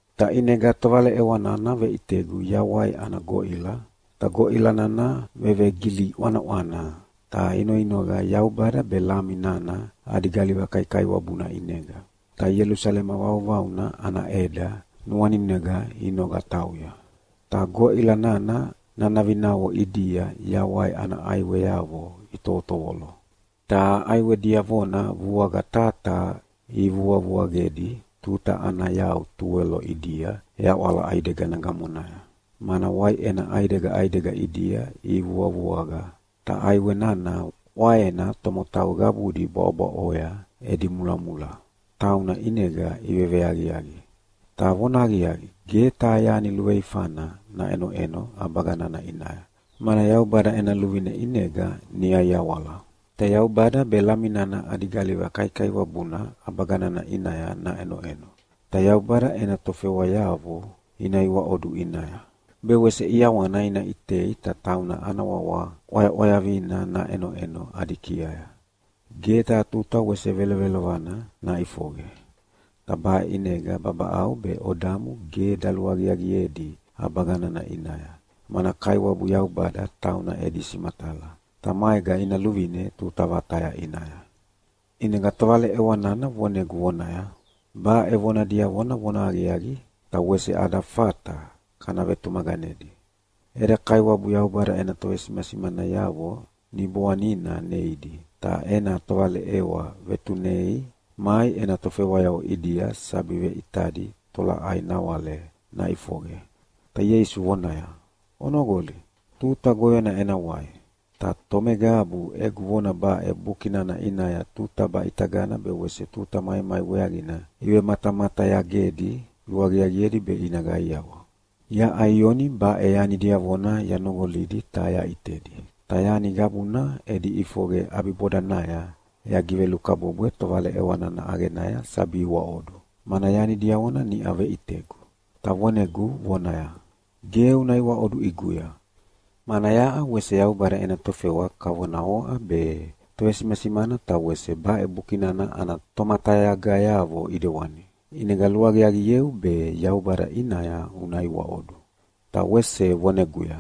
Ta ʼinega tovaleʼewa nana veʼitegu yawai ana goʼila, ta goʼila nana vevegili ʼwanaʼwana, ta inoinoqa Yaubada be Lami nana adi galiva kaikaiwabuna ʼinega, ta Ielusalema vauvauna ana ʼeda nuaninega inoqa tauya. Ta goʼila nana nanavinavo ʼidia yawai ana ʼaiweavo itovotovolo. Ta ʼaiwe diavona vuaqa taha taha ivuavuaqedi tuta ana yau tuwelo ʼidia yaʼwala ʼaidegana gamonaya, mana waiʼena ʼaidega ʼaidega ʼidia ivuavuaqa. Ta ʼaiwe nana ʼwaena tomotau qabudi bwaʼobwaʼoya edi mulamula, tauna ʼinega iveveaqiaqi. Ta vonahaqiaqi, ge taha yani luveifana naʼenoʼeno ʼabaga nana ʼinaya, mana Yaubada ena luvine ʼinega niʼa iawala. Ta Yaubada be Lami nana adi galiva kaikaiwabuna ʼabaga nana ʼinaya naʼenoʼeno, ta Yaubada ena tofewayavo ina iwaʼodu ʼinaya. Be wese ʼiawana ina ʼitei ta tauna ana wawa ʼwayaʼwayavina naʼenoʼeno adi kiaya. Ge taha tuta wese velovelovana naʼifoqe, ta baʼe ʼinega babaʼau be odamu ge daluaqiaqiedi ʼabaga nana ʼinaya, mana Kaiwabu Yaubada tauna edi simatala, ta maega ina luvine tuta vataya ʼinaya. ʼInega tovaleʼewa nana vonegu vonaya, “Baʼe vona diavona vonahaqiaqi ta wese ada fata kana vetumaqanedi. Eda Kaiwabu Yaubada ena tovesimasimanayavo Niboanina neidi, ta ena tovaleʼewa vetunei mai ena tofewayavo ʼidia sabi veʼitadi tolaʼai nawale naʼifoqe.” Ta Ieisu vonaya, “Onoqoli, tuta goyona ena wai. Ta tomeqabu egu vona baʼe Buki nana ʼinaya tuta baʼitagana be wese tuta maimai weaqina ivematamatayagedi luaqiaqiedi be ina qaiawa.” Yaʼa Ioni baʼe yani diavona yanoqolidi ta yaʼitedi. Ta yani qabuna edi ʼifoqe ʼabibodanaya yagivelukabwebwe tovaleʼewa nana ʼaqenaya sabi iwaʼodu, mana yani diavona niʼa veʼitegu. Ta vonegu vonaya, “Ge una iwaʼodu ʼiguya, mana yaʼa wese Yaubada ena tofewa kavona oʼa be tovesimasimana ta wese baʼe Buki nana ana tomatayagayavo ʼidewani. ʼInega luaqiaqieu be Yaubada ʼinaya una iwaʼodu.” Ta wese voneguya,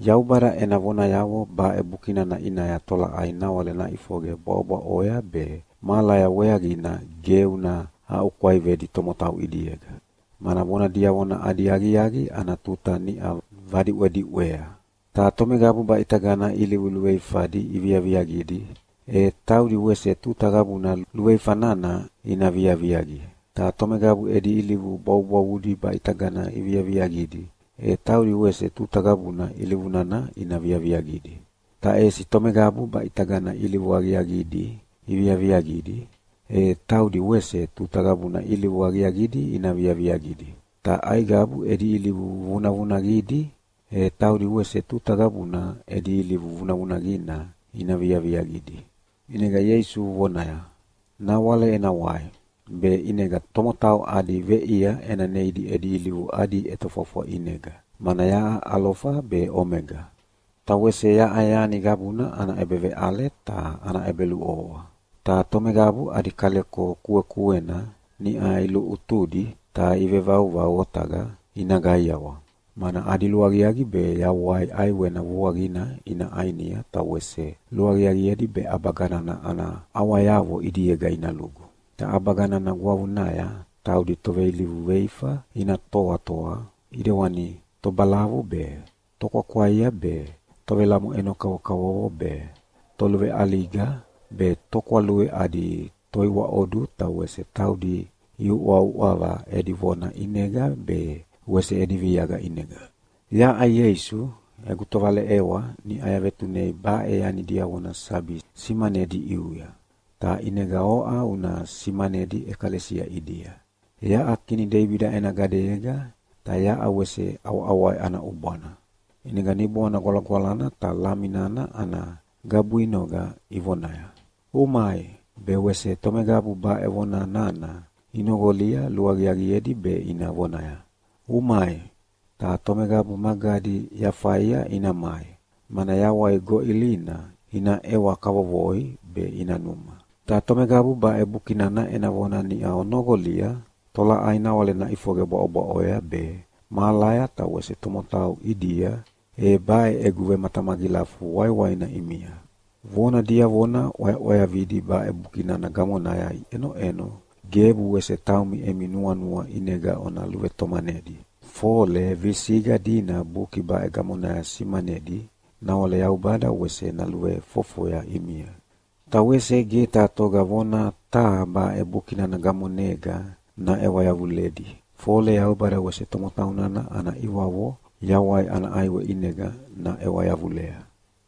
“Yaubada ena vonayavo baʼe Buki nana ʼinaya tolaʼai nawale naʼifoqe bwaʼobwaʼoya be mahalaya weaqina ge una aʼukwaivedi tomotau ʼidiega, mana vona diavona adi aqiaqi ana tuta niʼa vadiʼwediʼwea. Ta tomeqabu baʼitagana ilivu luveifadi iviaviaqidi, e taudi wese tuta qabuna luveifa nana ina viaviaqia, ta tomeqabu edi ilivu bwavubwavudi baʼitagana iviaviaqidi, e taudi wese tuta qabuna ilivu nana ina viaviaqidi. Ta ʼesi tomeqabu baʼitagana ilivu aqiaqidi iviaviaqidi, e taudi wese tuta qabuna ilivu aqiaqidi ina viaviaqidi, ta aiqabu edi ilivu vunavunaqidi, e taudi wese tuta qabuna edi ilivu vunavunaqina ina viaviaqidi.” ʼInega Ieisu vonaya, “Nawale ena wai, be ʼinega tomotau adi veʼia ena neidi edi ilivu adi ʼetofwafwa ʼinega, mana yaʼa Alofa be Omega, ta wese yaʼa yani qabuna ana ʼebeveʼale ta ana ʼebeluʼovoa. “Ta tomeqabu adi kaleko kuekuena niʼa iluʼutudi ta ivevauvau otaqa ina qaiawa, mana adi luaqiaqi be yawai ʼaiwena vuaqina ina ʼainia ta wese luaqiaqiedi be ʼabaga nana ana ʼawayavo ʼidiega ina lugu. Ta ʼabaga nana gwavunaya taudi toveilivu veifa ina toatoa ʼidewani tobalavu be, tokwakwaia be, tovelamoʼeno kavokavovo be, toluveʼaliga, be tokwalui adi toiwaʼodu ta wese taudi iuʼauʼava edi vona ʼinega be wese edi viaqa ʼinega. “Yaʼa Ieisu, egu tovaleʼewa niʼau yavetunei baʼe yani diavona sabi simanedi ʼiuya, ta ʼinega oʼa una simanedi ʼekalesia ʼidia. Yaʼa kini Deibida ena gadeyega ta yaʼa wese ʼawaʼawai ana ʼubwana.” ʼInega Niboana Gwalagwalana ta Lami nana ana gabuinoqa ivonaya, “Umai!” Be wese tomeqabu baʼe vona nana inoqolia luaqiaqiedi be ina vonaya, “Umai!” Ta tomeqabu magadi yafaia ina mai, mana yawai goʼilina ina ʼewa kavovoi be ina numa. Ta tomeqabu baʼe Buki nana ena vona niʼa onoqolia tolaʼai nawale naʼifoqe bwaʼobwaʼoya be, mahalaya ta wese tomotau ʼidia e baʼe egu vematamagilafu waiwaina ʼimia. Vona diavona ʼwayaʼwayavidi baʼe Buki nana gamonaya iʼenoʼeno gebu wese taumi emi nuanua ʼinega ona luvetomanedi, fole visiqa dina Buki baʼe gamonaya simanedi, nawale Yaubada wese naluvefofoya ʼimia. Ta wese ge taha toga vona taha baʼe Buki nana gamonega naʼewa yavuledi, fole Yaubada wese tomotau nana ana ʼiwavo yawai ana ʼaiwe ʼinega naʼewa yavulea.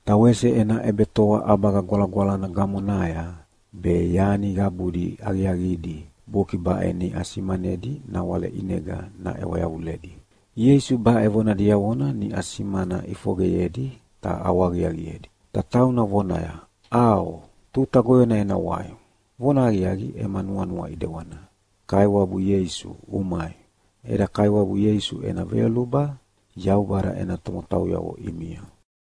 Ta wese ena ʼebetoa ʼabaga gwalagwalana gamonaya be yani qabudi aqiaqidi Buki baʼe niʼa simanedi nawale ʼinega naʼewa yavuledi. Ieisu baʼe vona diavona niʼa simana ʼifoqeyedi ta ʼawahaqiaqiedi, ta tauna vonaya, “ʼAo, tuta goyona ena wai!” Vonahaqiaqi ema nuanua ʼedewana. Kaiwabu Ieisu, umai! Eda Kaiwabu Ieisu ena veyoluba Yaubada ena tomotauyavo ʼimia.